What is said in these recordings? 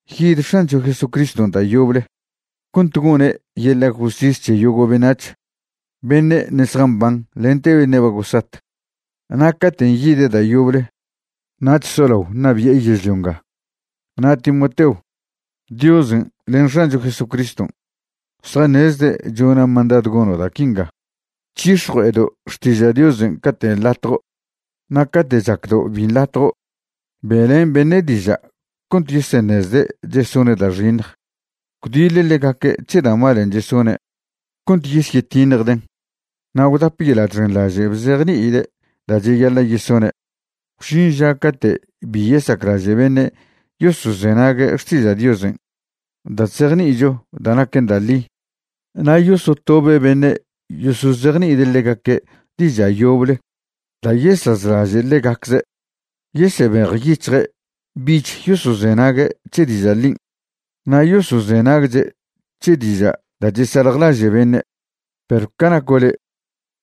Yid X̱ancho Jesucriston' da' yoble cont gone' yeḻa' justis c̱he yogo' beṉac̱h, beṉe' ṉe' zjamban lente beṉe' ba gosat, na' caten' yide' da' yoble nach solao ṉabi'e yežlio nga. Na' Timoteo, Diosen' len X̱ancho Jesucriston' zjaṉezde' chona' mandadw gono' da' quinga: C̱hix̱jue'edo' xtiža' Diosen' cate' nḻatjo' na' cate' chacdo' bi nḻatjo'. Be'len beṉe' diža' cont yeseṉezde' chesone' da' xiṉj, gwdiḻ ḻegaque' c̱he da' malen' chesone' cont yesyetiṉjden', na' gwdap yeḻa' chxenḻaže' bzejni'ide' da' cheyaḻa' yesone'. Gwžin ža cate' bi yesaclaže' beṉe' yosozenague' xtiža' Diosen' da' chzejni'icho da' naquen da' ḻi, na' yosotobe' beṉe' yosozejni'ide' ḻegaque' diža' yoble da' yesazlaže' ḻegacze'. Yesebejyic̱hje' bich yosozenague' c̱he diža' ḻin' na' yosozenagche' c̱he diža' da' chesaljlaže' beṉe'. Perw ca naco' le',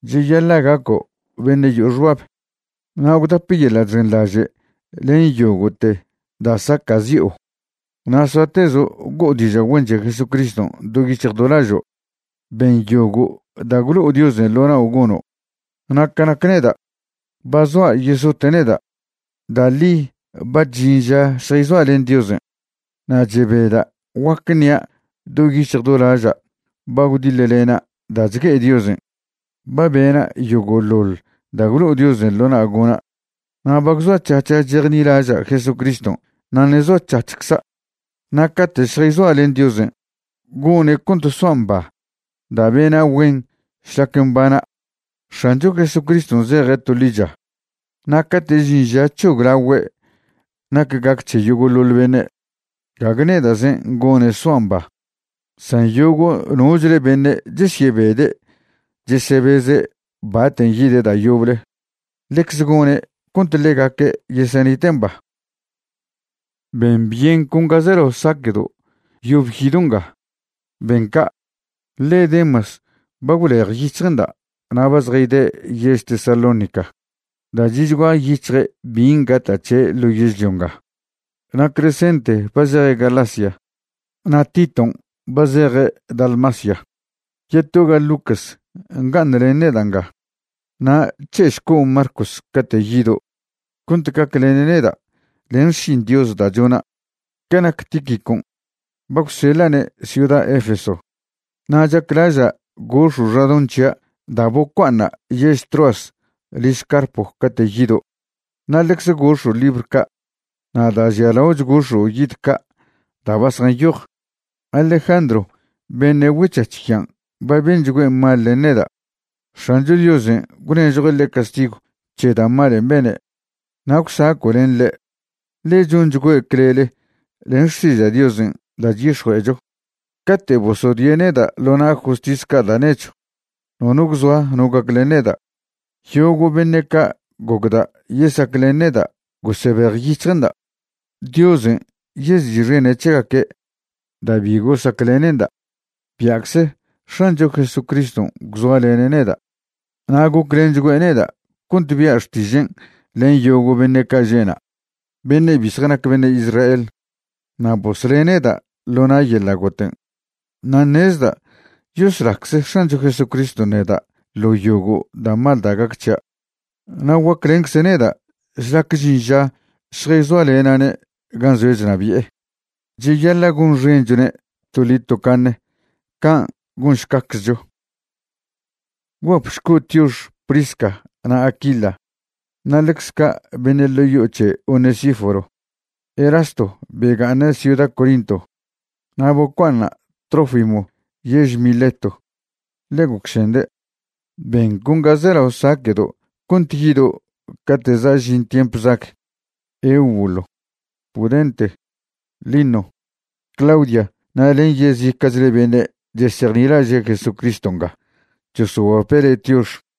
cheyaḻa' gaco' beṉe' yo'o xbab, na' gwdap yeḻa' chxenlaže' len yogo'te da' sacazi'o, na' soatezo' go'o diža' güen c̱he Jesucriston' do yic̱hj do lažo'. Ben yogo' da' gwlo'o Diosen' ḻo nao' gono'. Na' ca nac neda', ba zoa yesote' neda', da' ḻi ba chžin ža šjayzoa' len Diosen'. Na' chebeda' guac ṉia' do yic̱hj do laža' ba gwdiḻlena' da' chgue'e Diosen'. Ba bena' yogo'ḻoḻ da' gwlo'o Diosen' ḻo na' gona' na' ba gwzoac̱hac̱ha' chejnilaža' Jesucriston' na' ṉe' zoac̱hac̱hcza'. Na' cate' šjayzoa' len Diosen', gone' cont soa' mba da' bena' güen šlac mbana'. X̱ancho Jesucriston' zeje' to ḻicha, na' cate' žin ža c̱hoglagüe' nac gac c̱he yogo'ḻoḻ beṉe', gague neda'zen' gone' soa' mba, san yogo' nochle beṉe' chesyebede' chesebeze' baten' yide' da' yoble, ḻecze gone' cont ḻegaque' yesenite' mba. Ben byen con ga zelao saque'do' yob yido' nga. Ben ca', ḻe Demas ba gwlejyic̱hje'nda' na' ba zjayde' yež Tesalónica da' chi'chgua yic̱hje' bin' gata' c̱he' ḻo yežlio nga. Na' Crescente ba zeje' Galacia na' Titon' ba zeje' Dalmacia. Yetoga Lucas nga'aṉlen neda' nga. Na' c̱he'šco' Marcos cate' yido', cont gaclene' neda' len xšin Dios da' chona'. Ca nac Tíquicon', ba gwseḻa'ne' ciuda Efeso. Na' chaclaža' gox̱o' xadoṉ c̱hia' da' bocua'aṉa' yež Troas liž Carpo cate' yido', na' ḻecze gox̱o' libr ca', na' da' žialaoch gox̱o' yid ca' da' ba zjanyoj. Alejandro beṉe' güec̱hac̱h yan' ba benchgüe' mal len neda'. X̱ancho Diosen' gwnežjue' ḻe' castigw c̱he da' malen' bene'. Na' gwsaco' len ḻe', ḻe chonchgüe' clele len xtiža' Diosen' da' chyix̱jue'echo. Cate' bosodie' neda' ḻo na' justis ca' da' nechw, nono gwzoa no gaclen neda', yogo' beṉe' ca' gocda' yesaclen neda' gosebejyic̱hje'nda'. Diosen' yezi'xene' c̱hegaque' da' bi gosaclene'nda'. Bia'cze X̱ancho Jesucriston' gwzoalene' neda' na' goclenchgüe' neda' cont bia' xtižen' len yogo' beṉe' ca' že' na', beṉe' bi zjanac beṉe' Israel. Na' bosle' neda' ḻo na' yeḻa' goten'. Na' ṉezda' yoslacze X̱ancho Jesucriston' neda' ḻo yogo' da' mal da' gac c̱hia', na' guaclencze' neda' šlac žin ža šjayzoalena'ne' gan' zoe' chnabi'e. Cheyaḻa' gonxenchwne' toḻi tocaṉe. Can' gonšcaczcho. Gwguapšco' tiox Prisca na' Aquila na' ḻecz ca' beṉe' ḻo' yo'o c̱he Onesíforo. Erasto bega'aṉe' ciuda Corinto, na' bocua'aṉa' Trófimo yež Mileto, ḻe gocšende'. Ben con ga zelao saque'do' cont yido' cate' za' žin tiemp zag. Eubulo, Pudente, Lino, Claudia na' len yezica'chle beṉe' chesejnilaže' Jesucriston' nga chosoguape' le' tiox.